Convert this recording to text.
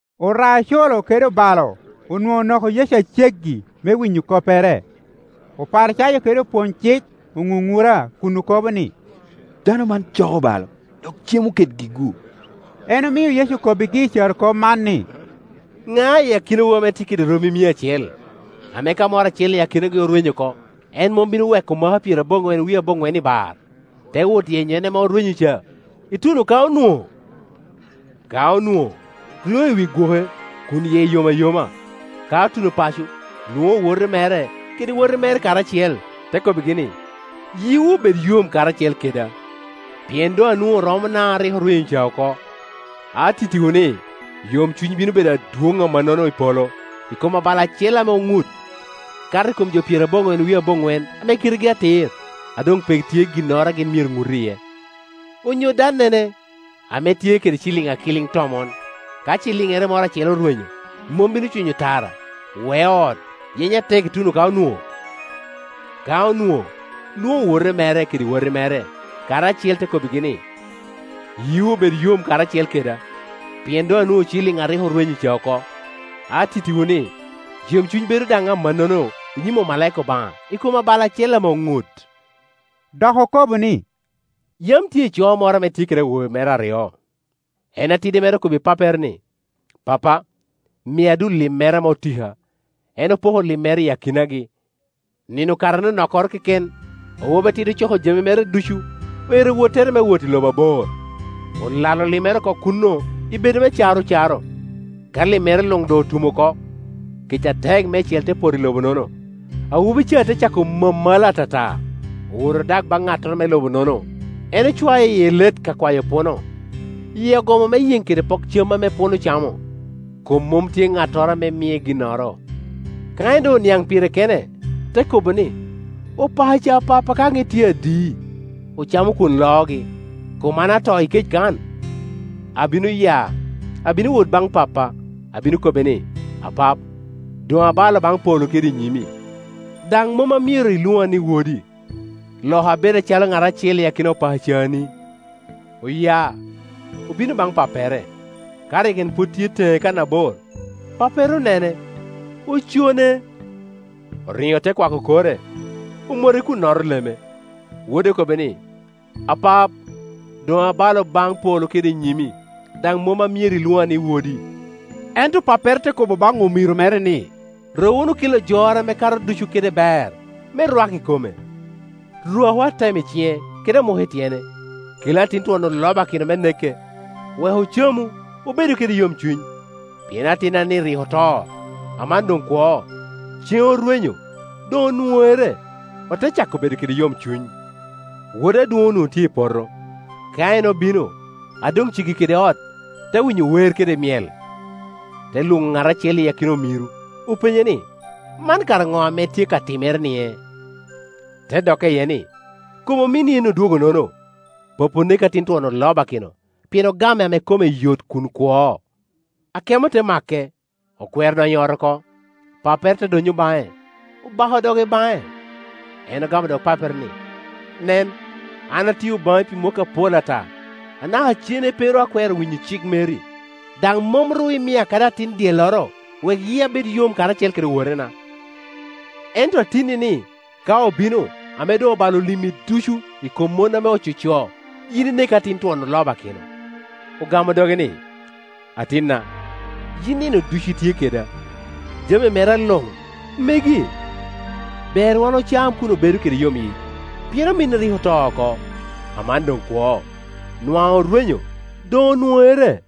Ora-coro kede obalo onwoŋo onoko Yecu a ceggi me winyo koppere. Oparicayo kede opwony-cik oŋuŋura kun okobo ni, “Dano man coko obalo, dok cemo kedgi-gu.” En omio Yecu okobbigi carokop man ni, “Ŋa i akinawu ame tye kede romi mia acel, ame ka moro acel i akinagi orwenyo oko, en mom bino weko maka pyeraboŋwen wie aboŋwen i bar, te wot yenyo en ame orwenyo ca, ituno ka onwoŋo? Ka onwoŋo, ryoŋo i wi gwoke kun yie yom ayoma. Ka otuno paco, lwoŋo owote mere kede wati mere karacel, te kobbigi ni, ‘Yiwu obed yom karacel keda, pien doŋ anwoŋo romona a rik rweny ca oko.’ Atittiwu ni, yomcuny bino bedo adwoŋ amannono i polo i kom abalo acel ame oŋut, kato i kom jo pyeraboŋwen wie aboŋwen ame kitegi atir, a doŋ pe tye ginnoro a gin myero ŋut iye. “Onyo dannene ame tye kede ciliŋ akilin tomon, ka ciliŋŋere moro acel orwenyo, mom bino cwinyo tara, weo ot, yenyo atek ituno ka onwoŋo? Ka onwoŋo, lwoŋo owote mere kede wati mere karacel, te kobbigi ni, ‘Yiwu obed yom karacel keda, pien doŋ anwoŋo ciliŋŋa a rik rweny ca oko.’ Atittiwu ni, yomcuny bedo daŋ amannono i nyim omalaika Obaŋa i kom abalo acel ame oŋut.” Dok okobo ni, “Yam tye ico moro ame tye kede awobe mere aryo. En atidi mere okobbi pappere ni, ‘Pappa, mia dullim mera ame otika.’ En opoko limmere i akinagi. Nino okato anokkoro keken, awobi atidi ocoko jami mere ducu, oero wottere me wot i lobo abor. Olalo limmere oko kuno i bedo me caro caro. Ka limmere luŋ doŋ otum oko, kec atek meicel te poto i lobo-nono, awobi ca te cako mamala atata. Owoto odak baŋ ŋattoro me lobo-nono; en ocwae i elet ka kwayo puno. Yie ogomo me yeŋ kede pok cam ame puno camo, kom mom tye ŋattoro a mie ginnoro. Ka en doŋ oniaŋ pire kene, te kobo ni, ‘Opakaca a pappa ka ŋit tye adi, ocamo kwon loogi, kom an ata i kec kan! Abino ya, abino wot baŋ pappa, abino kobbe ni, “Apap, doŋ abalo baŋ polo kede nyimi, daŋ mom amyero ilwoŋa ni wedo. Loka abed acalo ŋat acel i akina opakacani.” ’ Oya, obino baŋ pappere. Ka rik en pwod tye teŋe kannabor, pappere onene. Ocone; oriŋo te kwako kore, omote kun noto leme. Wode okobbe ni, ‘Apap, doŋ abalo baŋ polo kede i nyimi, daŋ mom amyero ilwoŋa ni wodi.’ Ento pappere te kobo baŋ omiro mere ni, ‘Ru wunu kelo jor ame kato ducu kede ber me rwak i kome. Rwaku atem i ciŋe, kede amuk i tyene. Kelu atin twon olobakino me nekke, wek ocamu, obedu kede yomcuny. Pien atinna-ni rik oto, aman doŋ kwo; ceŋ orwenyo, doŋ onwoŋere.’ Ote cako bedo kede yomcuny. “Wode adwoŋ onwoŋo tye i poto. Ka en obino, a doŋ ceggi kede ot, te winyo wer kede myel. Te lwoŋo ŋat acel i akina omiro, openye ni, ‘Man kara ŋo ame tye ka timere-nie?’ Te dokke iye ni, ‘Kom ominni en odwogonono, pappi onekke atin twon olobakino, pien ogame ame kome yot kun kwo.’ Akemo te make, okwero donyo i ot oko. Pappere te donnyo baŋe, obako doge baŋe. En ogamo dog pappere ni, ‘Nen, an atio baŋi pi mwakki apol ata, anaka cene pe ru akwero winyo cik meri, daŋ mom ru imia kadi atin dyelloro wek yia bed yom karacel kede owotena. Ento atinni-ni ka obino, ame doŋ obalo limmi ducu i kom mon ame ococo, yin inekke atin twon olobakino!’ Ogamo doge ni, ‘Atinna, yin nino ducu itye keda, jami mera luŋ megi. Ber wan ocam kun obedo kede yomyic, pien ominni rik oto oko, aman doŋ kwo; nwaŋ orwenyo, doŋ onwoŋere.’”